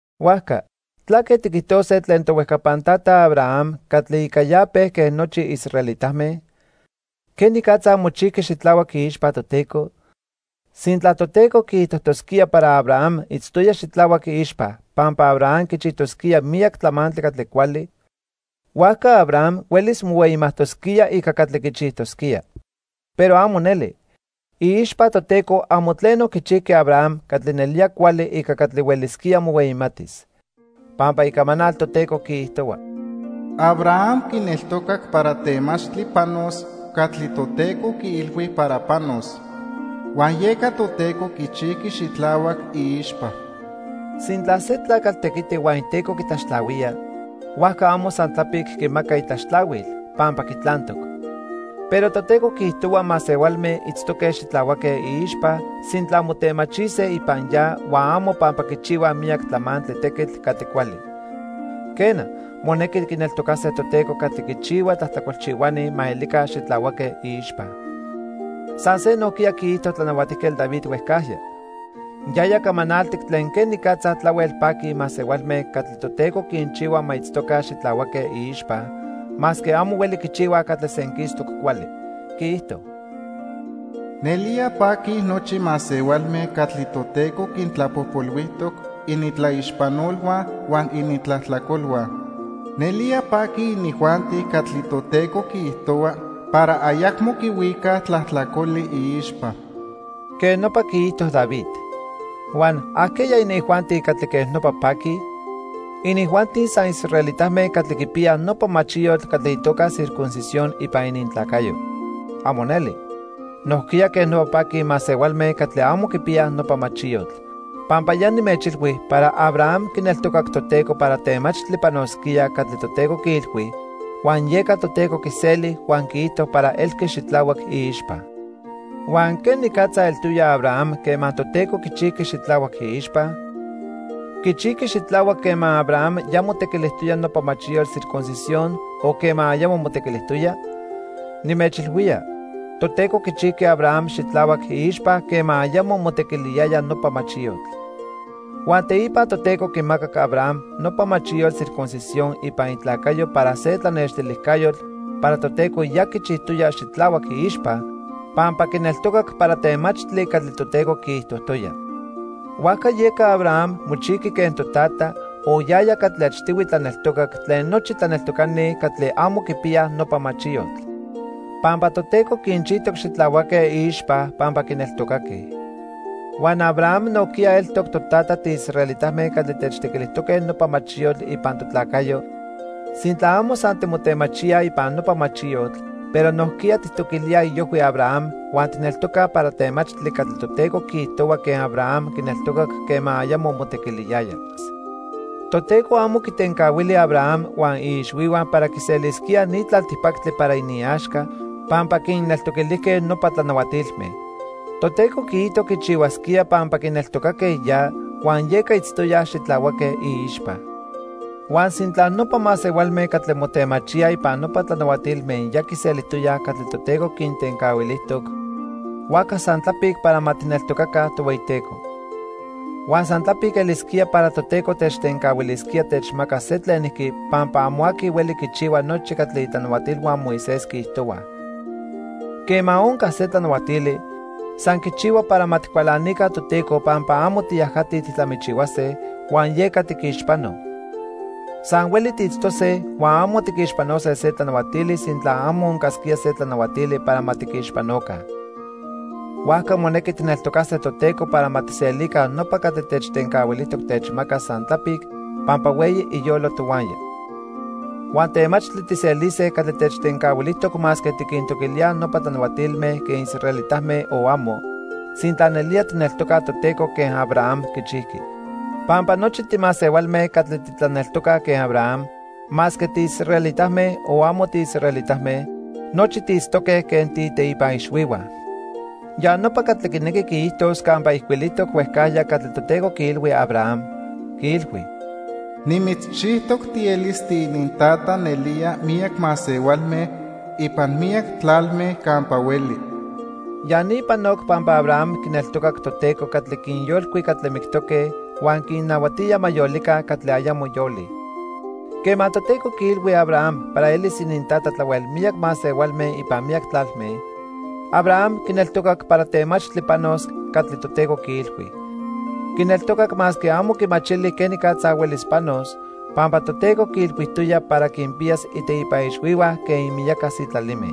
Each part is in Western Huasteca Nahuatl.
Huajca ¿tlaque tiquijtose tlen tohuejcapan tata Abraham catli ica ya pejque nochi israelitame? ¿Quenicatza mochijqui xitlahuac iixpa Toteco? Sintla Toteco quiijtojtosquía para Abraham itztoya xitlahuac iixpa pampa Abraham quichijtosquía miyac tlamantli catli cuali, huajca Abraham huelis mohueyimajtosquía ica catli quichijtosquía. Pero amo neli. Iixpa Toteco amo tleno quichijqui Abraham catli nelía cuali ica catli huelisquía mohueyimatis. Pampa Icamanal Toteco quiijtohua: "Abraham quineltocac para temachtli panos catli Toteco quiilhui para panos, huan yeca Toteco quichijqui xitlahuac iixpa." Sintla se tlacatl tequiti huan iteco quitlaxtlahuía, huajca amo san tlapic quimaca itlaxtlahuil, pampa quitlantoc. Pero Toteco quiijtohua masehualme itztoque xitlahuaque iixpa sintla motemachise ipan ya huan amo pampa quichihuaj miyac tlamantli tequitl catli cuali. Quena, monequi quineltocase Toteco catli quinchihua tlajtlacolchihuani ma elica xitlahuaque iixpa. San se nojquiya quiijto Tlanahuatijquetl David huejcajya. Yaya camanaltic tlen quenicatza tlahuel paquij masehualme catli Toteco quinchihua ma itztoca xitlahuaque iixpa, masque amo hueli quichihuaj catli senquistoc cuali. Quiijto: "Nelía paquij nochi masehualme catli Toteco quintlapojpolhuijtoc inintlaixpanolhua huan inintlajtlacolhua. Nelía paquij inijuanti catli Toteco quiijtohua para ayacmo quihuicaj tlajtlacoli iixpa." Quej nopa quiijto David. Huan ¿ajqueya inijuanti catli quej nopa paquij? ¿Inijuanti san israelitame catli quipiyaj nopa machiyotl catli itoca circuncisión ipan inintlacayo? ¡Amo neli! Nojquiya quej nopa paquij masehualme catli amo quipiyaj nopa machiyotl. Pampa ya nimechilhui para Abraham quineltocac Toteco para temachtli panosquía catli Toteco quiilhui, huan yeca Toteco quiseli huan quiijto para elqui xitlahuac iixpa. ¿Huan quenicatza eltoya Abraham quema Toteco quichijqui xitlahuac iixpa? ¿Quichijqui xitlahuac quema Abraham ya motequilijtoya nopa machiyotl circuncisión o quema ayamo motequilijtoya? Nimechilhuía, Toteco quichijqui Abraham xitlahuac iixpa quema ayamo motequiliyaya nopa machiyotl. Huan teipa Toteco quimacac Abraham nopa machiyotl circuncisión ipan itlacayo para se tlanextilijcayotl para Toteco ya quichijtoya xitlahuac iixpa pampa quineltocac para temachtli catli Toteco quiijtojtoya. Huajca yeca Abraham mochijqui quen totata, o yaya catli achtihui tlaneltocac, tlen nochi tlaneltocani catli amo quipiyaj nopa machiyotl. Pampa Toteco quinchijtoc xitlahuaque iixpa pampa quineltocaque. Huan Abraham nojquiya eltoc totata tiisraelitame catli techtequilijtoque nopa machiyotl ipan totlacayo sintla amo san timotemachíaj ipan nopa machiyotl, pero nojquiya tijtoquilíaj iojhui Abraham huan tijneltocaj para temachtli catli Toteco quiijtohua quen Abraham quineltocac quema ayamo motequiliyaya. Toteco amo quitencahuili Abraham huan iixhuihua para quiselisquíaj ni tlaltipactli para iniaxca pampa quinneltoquilijque nopa tlanahuatilme. Toteco quiijto quichihuasquía pampa quineltocaque ya, huan yeca itztoyaj xitlahuaque iixpa. Huan sintla nopa masehualme catli motemachíaj ipan nopa tlanahuatilme ya quiselijtoyaj catli Toteco quintencahuilijtoc, huajca san tlapic para ma tijneltocaca Tohueyiteco. Huan san tlapic elisquía para Toteco techtencahuilisquía techmacas se tlenijqui pampa amo aqui hueli quichihua nochi catli itlanahuatilhua Moisés quiijtohuaj. Quema onca se tlanahuatili, san quichihua para ma tijcualanica Toteco pampa amo tiyajatij tijtlamichihuase, huan yeca tiquixpanoj. San hueli tiitztose huan amo tiquixpanose se tlanahuatili sintla amo oncasquía se tlanahuatili para ma tiquixpanoca. Huajca monequi tijneltocase Toteco para ma tijselica nopa catli techtencahuilijtoc techmacas san tlapic pampa hueyi iyolo tohuaya. Huan temachtli tijselise catli techtencahuilijtoc masque tiquintoquilíaj nopa tlanahuatilme quen israelitame o amo, sintla nelía tijneltocaj Toteco quen Abraham quichijqui. Pampa nochi timasehualme catli titlaneltocaj quen Abraham, masque tiisraelitame, o amo tiisraelitame, nochi tiitztoque quen tiiteipa ixhuihua. Ya nopa catli quinequi quiijtos campa ijcuilijtoc huejcajya catli Toteco quiilhui Abraham, quiilhui: "Nimitzchijtoc tielis tiinintata nelía miyac masehualme ipan miyac tlalme campa hueli." Ya ni panoc pampa Abraham quineltocac Toteco catli quinyolcui catli mictoque huan quinnahuatía ma yolica catli ayamo yolij. Quema Toteco quiilhui Abraham para elis inintata tlahuel miyac masehualme ipan miyac tlalme, Abraham quineltocac para temachtli panos catli Toteco quiilhui. Quineltocac masque amo quimachili quenicatza huelis panos, pampa Toteco quiilhuijtoya para quinpiyas iteipa ixhuihua quen ininmiyaca sitlalime.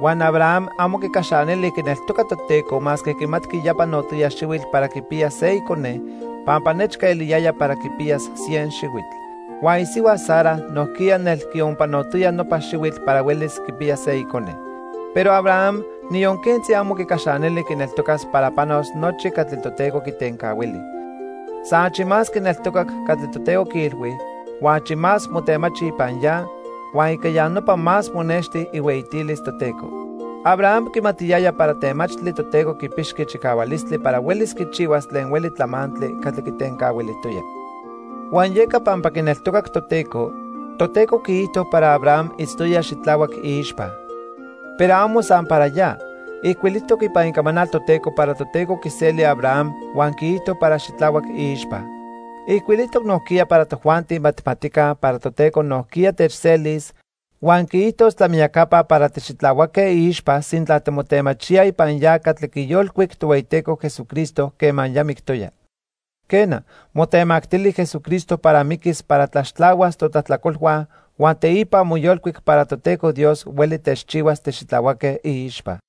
Huan Abraham amo quicaxanili quineltoca Toteco masque quimatqui ya panotoya xihuitl para quipiyas se icone pampa nechca eliyaya para quipiyas cien xihuitl. Huan isihua Sara nojquiya nel quionpanotoya nopa xihuitl para huelis quipiyas se icone. Pero Abraham, niyon quentzi amo quicaxanili quineltocas para panos nochi catli Toteco quitencahuili. San achi más quineltocac catli Toteco quiilhui, huan achi más motemachi ipan ya, huan ica ya nopa más monexti ihueyitilis Toteco. Abraham quimatiyaya para temachtli Toteco quipixqui chicahualistli para huelis quichihuas tlen hueli tlamantli catli quitencahuilijtoya. Huan yeca pampa quineltocac Toteco, Toteco quiijto para Abraham itztoya xitlahuac iixpa. Pero amo san para ya, ijcuilijtoc ipan Icamanal Toteco para Toteco quiseli Abraham huan quiijto para xitlahuac iixpa. Ijcuilijtoc nojquiya para tojuanti ma tijmatica para Toteco nojquiya techselis, huan quiijtos tlamiyacapa para tixitlahuaque iixpa sintla timotemachíaj ipan ya catli quiyolcuic Tohueyiteco Jesucristo quema ya mictoya. Quena, motemactili Jesucristo para miquis para tlaxtlahuas totlajtlacolhua huan teipa moyolcuic para Toteco Dios hueli techchihuas tixitlahuaque iixpa.